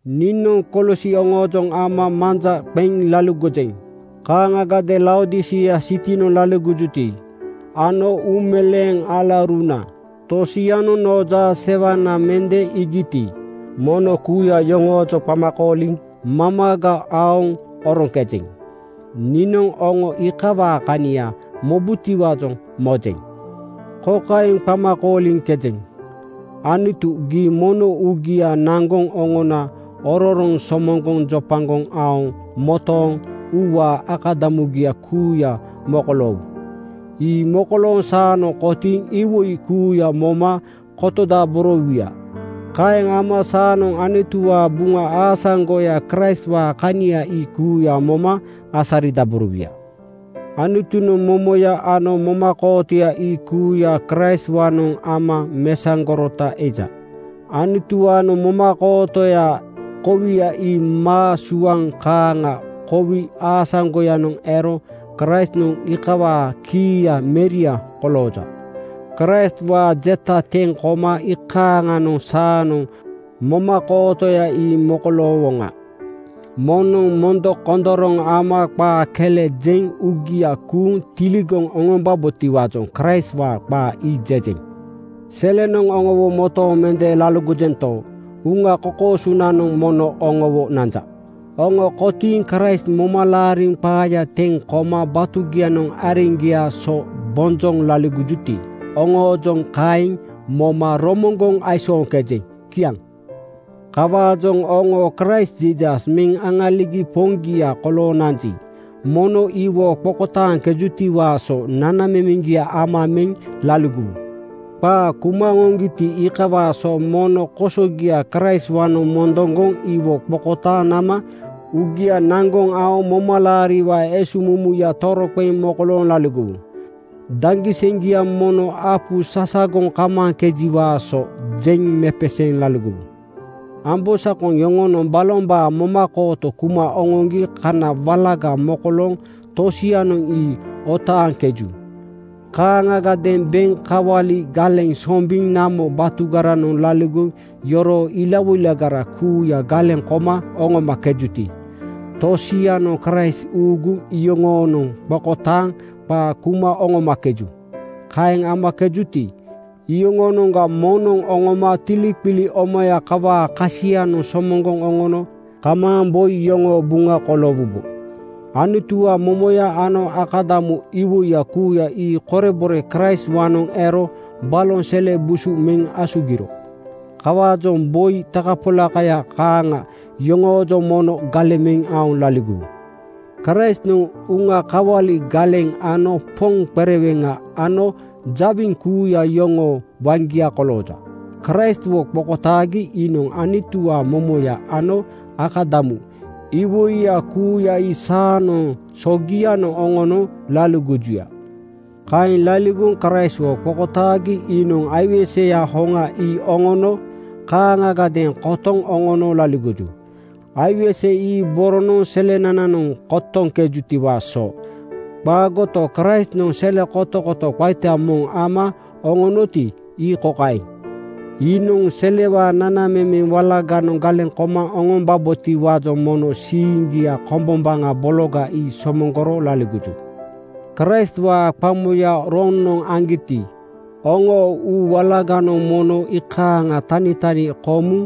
Niinoŋ Kolosi oŋoojoŋ ama manja qeŋ laligojeŋ. Kaaŋagadeeŋ Laodisia sitinoŋ laligojuti ano uumeleeŋ alauruna tosianoŋ noo jaasewana mende iigiti, mono kuuya yoŋoojoŋ qama kooliŋ mamaga aoŋ oroŋkejeŋ. Niinoŋ oŋo iikawaa kania mobutiwaajoŋ mojeŋ. Kokaeŋ qama kooliŋkejeŋ: Anutu, gii mono uugia naŋgoŋ oŋona ororoŋ somoŋgoŋ jopagoŋ aoŋ motooŋ uuwaa akadamugia kuuya mokoloowu. Ii mokolooŋ saanoŋ kotiiŋ iwoi kuuya moma kotodaborowuya. Kaeŋ ama saanoŋ Anutuwaa Buŋa aasaŋgoya, Kraistwaa kania ii kuuya moma asaridaborowuya. Anutunoŋ momoya ano momakootoya ii kuuya Kraistwaanoŋ ama mesaŋgorota eja. Anutuwaanoŋ momakootoyaa kowia ii maa suaŋ kaaŋa kowi aasaŋgoyanoŋ ero Kraistnoŋ iikawaa kiiya meria kolooja. Kraistwaa jeta teŋ koma iikaaŋanoŋ saanoŋ momakootoya ii mokoloowoŋa. Moŋnoŋ mondokondoroŋ ama qaa kele jeŋ uugia kuuŋ tiligoŋ oŋombabotiwaajoŋ Kraistwaa qaa ii jejeŋ. Selenoŋ oŋowo motooŋ mende laligojento, uŋa kokoosonanoŋ mono oŋowo nanja. Oŋo kotiiŋ Kraist moma laariŋ qaaya teŋ koma batugianoŋ areŋgiaa so bonjoŋ laligojuti, oŋoojoŋ kaeŋ moma romoŋgoŋ aisooŋkejeŋ. Kiaŋ. Kawaajoŋ oŋo Kraist Jiisas meŋ aŋaligi Poŋgia kolooŋ nanji, mono iwo qokotaaŋkejutiwaa so nanamemeŋgia ama meŋ laligowu. Qaa kuma oŋoŋgiti, iikawaa so mono kosogia Kraistwaanoŋ mondoŋgoŋ iwo qokotaaŋ nama uugia naŋgoŋ aoŋ momalaariwaa esuŋmumuya toroqeŋ mokolooŋ laligowu. Daŋgiseŋgia mono apu sasagoŋ kamaaŋkejiwaa so jeŋ mepeseeŋ laligowu. Ambosakoŋ yoŋonoŋ balombaa momakooto kuma oŋoŋgi kana walaga mokolooŋ tosianoŋ ii otaaŋkeju. Kaaŋagadeeŋ beŋ kawali galeŋ sombiŋ namo batugaranoŋ laligoŋ yoroo ilawoilagara kuuya galeŋ koma oŋomakejuti, tosianoŋ Kraist uuguŋ iyoŋoonoŋ qokotaaŋ qaa kuma oŋomakeju. Kaeŋ amakejuti, iyoŋoonoŋga moŋnoŋ oŋoma tiliqili omaya kawaa kasianoŋ somoŋgoŋ oŋono kamaaŋ boi iyoŋoo buŋa koloowubo. Anutuwaa momoya ano akadamu iwoiya kuuya ii korebore Kraistwaanoŋ ero baloŋ sele busu meŋ asugiro. Kawaajoŋ boi takapolakaya kaaŋa yoŋoojoŋ mono galeŋ meŋ aoŋ laligowu. Kraistnoŋ uŋa kawali galeŋ ano poŋ qereweŋa ano jawiŋ kuuya yoŋoo waŋgia kolooja. Kraistwo qokotaagi iinoŋ Anutuwaa momoya ano akadamu iwoiya kuuya ii saanoŋ sogianoŋ oŋono laligojuya. Kaeŋ laligoŋ Kraistwo qokotaagi iinoŋ aiweseya hoŋa ii oŋoonoŋ kaaŋagadeeŋ kotoŋ oŋono laligoju. Aiwese ii boronoŋ selenananoŋ kotoŋkejutiwaa so qaagoto, Kraistnoŋ sele kotokoto qaita moŋ ama oŋonoti, ii kokaeŋ: Iinoŋ selewaa nanamemeŋ wala-ganoŋ galeŋ koma oŋombabotiwaajoŋ mono siiŋgia kombombaŋa bologa ii somoŋgoro laligoju. Kraistwaa qamoya roŋnoŋ aŋgiti, oŋoo uu walaganoŋ mono iikaaŋa tanitani komuŋ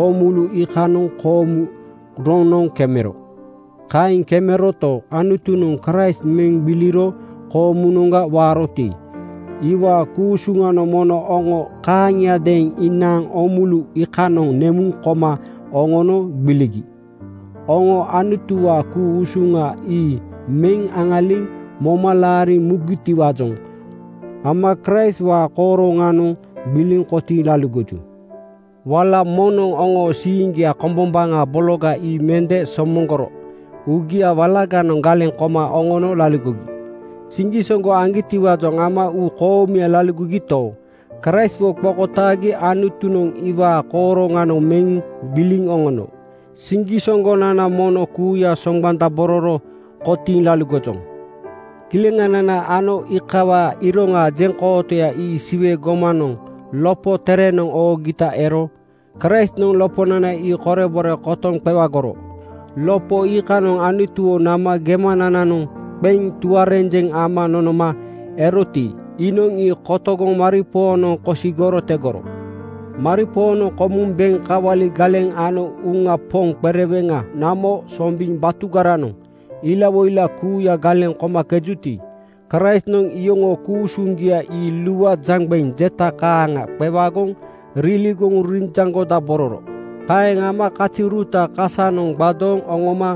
oomulu iikanoŋ koomu roŋnoŋ kemero. Kaeŋ kemeroto, Anutunoŋ Kraist meŋ gbiliro koomunoŋga waaroti, iwaa ku-usuŋanoŋ mono oŋo kaaŋia-deeŋ inaaŋ oomulu iikanoŋ nemuŋ koma oŋono gbiligi. Oŋo Anutuwaa ku-usuŋa ii meŋ aŋaliŋ moma laariŋ mugitiwaajoŋ ama Kraistwaa kooroŋanoŋ gbiliŋ kotiiŋ laligoju. Wala moŋnoŋ oŋoo siiŋgia kombombaŋa bologa ii mende somoŋgoro uugia walaganoŋ galeŋ koma oŋono laligogi. Siŋgisoŋgo aŋgitiwaajoŋ ama uu koomuya laligogito, Kraistwo qokotaagi Anutunoŋ iwaa kooroŋanoŋ meŋ gbiliŋ oŋono. Siŋgisoŋgonana mono kuuya soŋgbandabororo kotiiŋ laligojoŋ. Kileŋanana ano iikawaa iroŋaa jeŋkootoya ii Siwe gomanoŋ lopo terenoŋ oogita ero. Kraistnoŋ loponana ii korebore kotoŋ qewagoro. Lopo iikanoŋ Anutuwo nama gemanananoŋ qeŋ tuarenjeŋ ama nonoma eroti, iinoŋ ii kotogoŋ maripoonoŋ kosigoro tegoro. Maripoonoŋ komuŋ beŋ kawali galeŋ ano uŋa poŋ qereweŋa namo sombiŋ batugaranoŋ ilawoila kuuya galeŋ komakejuti, Kraistnoŋ iyoŋoo ku-usuŋgia ii lua jaŋgbeŋ jeta kaaŋa qewagoŋ riligoŋ rijoŋgodabororo. Kaeŋ ama kaziuruta kasanoŋ gbadooŋ oŋoma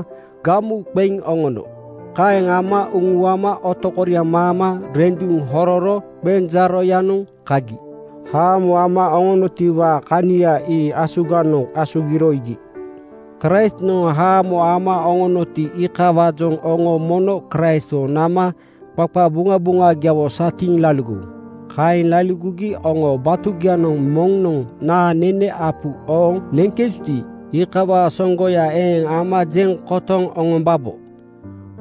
gamu qeŋ oŋono. Kaeŋ ama uŋuama otokoriaŋ maama renduŋ hororo qenjaaroyanoŋ kagi haamo ama oŋonotiwaa kania ii asuganoŋ asugiro iigi. Kraistnoŋ haamo ama oŋonoti, iikawaajoŋ oŋo mono Kraistwo nama qaqabuŋabuŋagiawo satiiŋ laligowu. Kaeŋ laligogi oŋoo batugianoŋ moŋnoŋ naa nene apuga ooŋ neŋkejuti, iikawaa soŋgoya eeŋ ama jeŋ kotoŋ oŋombabo.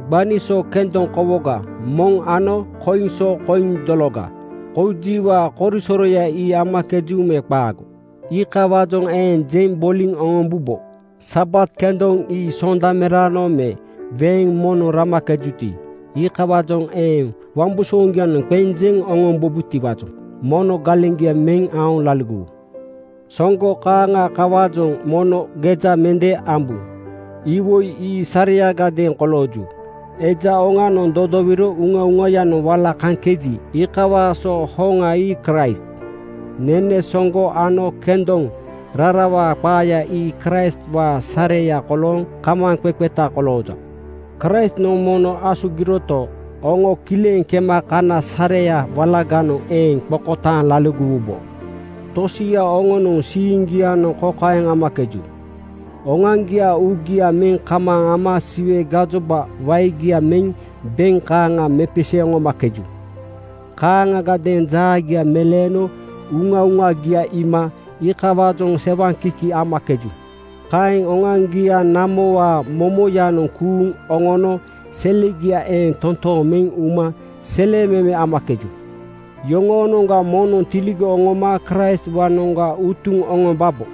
Gbani so kendoŋ kowoga moŋ ano koiŋ so koiŋ dologa koujiwaa korisoroya ii amakeju me qaago, iikawaajoŋ eeŋ jeŋ boliŋ oŋombubo. Sabat kendoŋ ii Sondameraanoŋ me weeŋ moŋnoŋ ramakejuti, iikawaajoŋ eeŋ wambusooŋgianoŋ qeŋ jeŋ oŋombubotiwaajoŋ mono galeŋgia meŋ aoŋ laligowu. Soŋgo kaaŋa kawaajoŋ mono geja mende ambu. Iwoi ii sareyagadeeŋ kolooju. Eja oŋanoŋ dodowiro uŋauŋayanoŋ wala kaŋkeji, iikawaa so hoŋa ii Kraist. Nene soŋgo ano kendoŋ rarawaa qaaya ii Kraistwaa sareya kolooŋ kamaaŋqeqeta kolooja. Kraistnoŋ mono asugiroto, oŋo kileŋ kema kana sareya walaganoŋ eeŋ qokotaaŋ laligowubo. Tosia oŋonoŋ siiŋgianoŋ kokaeŋ amakeju: Oŋoaŋgiaa uugia meŋ kamaaŋ ama Siwe gajoba waegia meŋ beŋ kaaŋa mepeseeŋ oŋomakeju. Kaaŋagadeeŋ jaagia meleeno uŋauŋagia iima iikawaajoŋ sewaŋkiki amakeju. Kaeŋ oŋoaŋgiaa namowaa momoyanoŋ kuuŋ oŋono selegia eeŋ totooŋ meŋ uma selememe amakeju. Yoŋoonoŋga moŋnoŋ tiligoŋ oŋoma Kraistwaanoŋga utuŋ oŋombabo.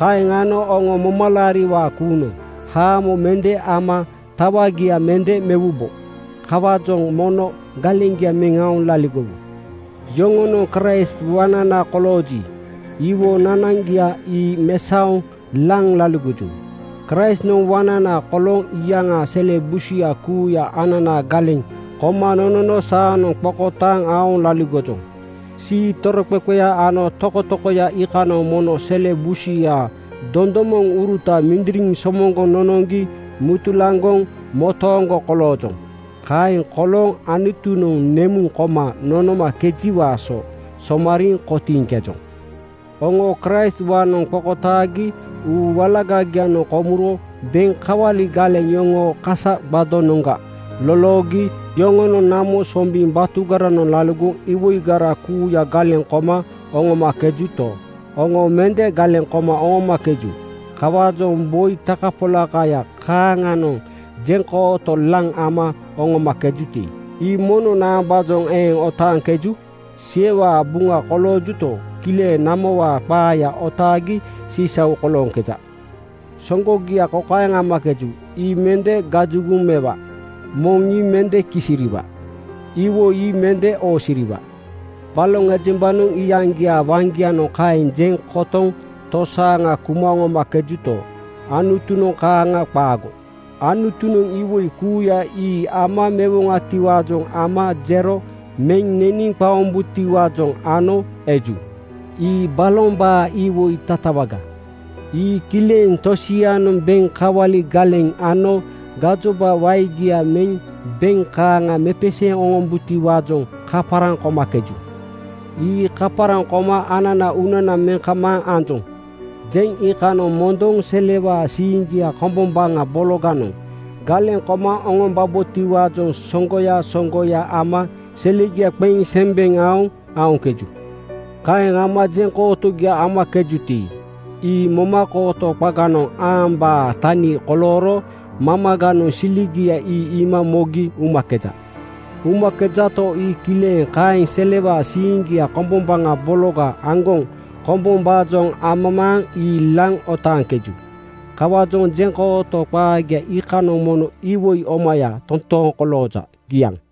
Kaeŋ ano oŋo momalaariwaa kuunoŋ haamo mende ama tawagia mende mewubo. Kawaajoŋ mono galeŋgia meŋ aoŋ laligowu. Yoŋonoŋ Kraist waŋnana kolooji, iwo nanaŋgia ii mesaoŋ laŋ laligoju. Kraistnoŋ waŋnana kolooŋ iyaŋaa sele busuya kuuya anana galeŋ koma nonono saanoŋ qokotaaŋ aoŋ laligojoŋ. Sii toroqeqeya ano tokotokoya iikanoŋ mono sele busuyaa dondomoŋuruta mindiriŋ somoŋgoŋ nonoŋgi metulaŋgoŋ motooŋgo koloojoŋ. Kaeŋ kolooŋ Anutunoŋ nemuŋ koma nonomakejiwaa so somariiŋ kotiiŋkejoŋ. Oŋo Kraistwaanoŋ qokotaagi uu walagagianoŋ komuro beŋ kawali galeŋ yoŋoo kasa gbadonoŋga loloogi. Yoŋonoŋ namo sombiŋ batugaranoŋ laligoŋ iwoigara kuuya galeŋ koma oŋomakejuto, oŋo mende galeŋ koma oŋomakeju. Kawaajoŋ boi takapolakaya kaaŋanoŋ jeŋkooto laŋ ama oŋomakejuti, ii mono naambaajoŋ eeŋ otaaŋkeju? Siwewaa buŋa koloojuto, kileŋ namowaa qaaya otaagi sisau kolooŋkeja. Soŋgogia kokaeŋ amakeju, “Ii mende gajugoŋ mewa. Moŋ ii mende kisiriiwa. Iwoi ii mende oosiriwa.” Baloŋ ejembanoŋ iyaŋgiaa waŋgianoŋ kaeŋ jeŋ kotoŋ tosaaŋa kuma oŋomakejuto, Anutunoŋ kaaŋa qaago. Anutunoŋ iwoi kuuya ii ama mewoŋatiwaajoŋ ama jero meŋ neniŋ qaombutiwaajoŋ ano eju. Ii balombaa iwoi tatawaga. Ii kileŋ tosianoŋ beŋ kawali galeŋ ano gajoba waegia meŋ beŋ kaaŋa mepeseeŋ oŋombutiwaajoŋ kaparaŋ komakeju. Ii kaparaŋ koma “Ananaa uunana meŋ kamaaŋ anjoŋ,” jeŋ iikanoŋ mondoŋ selewaa siiŋgia kombombaŋa bologanoŋ galeŋ koma oŋombabotiwaajoŋ soŋgoya soŋgoya ama selegia qeŋ sembeŋ aoŋ aoŋkeju. Kaeŋ ama jeŋkootogia amakejuti, ii momakooto qaganoŋ aambaa tani kolooro mamaganoŋ siligia ii iima mogi umakeja. Umakejato, ii kileŋ kaeŋ selewaa siiŋgia kombombaŋa bologa aŋgoŋ kombombaajoŋ amamaaŋ ii laŋ otaaŋkeju. Kawaajoŋ jeŋkooto qaagia iikanoŋ mono iwoi omaya totooŋ kolooja. Kiaŋ.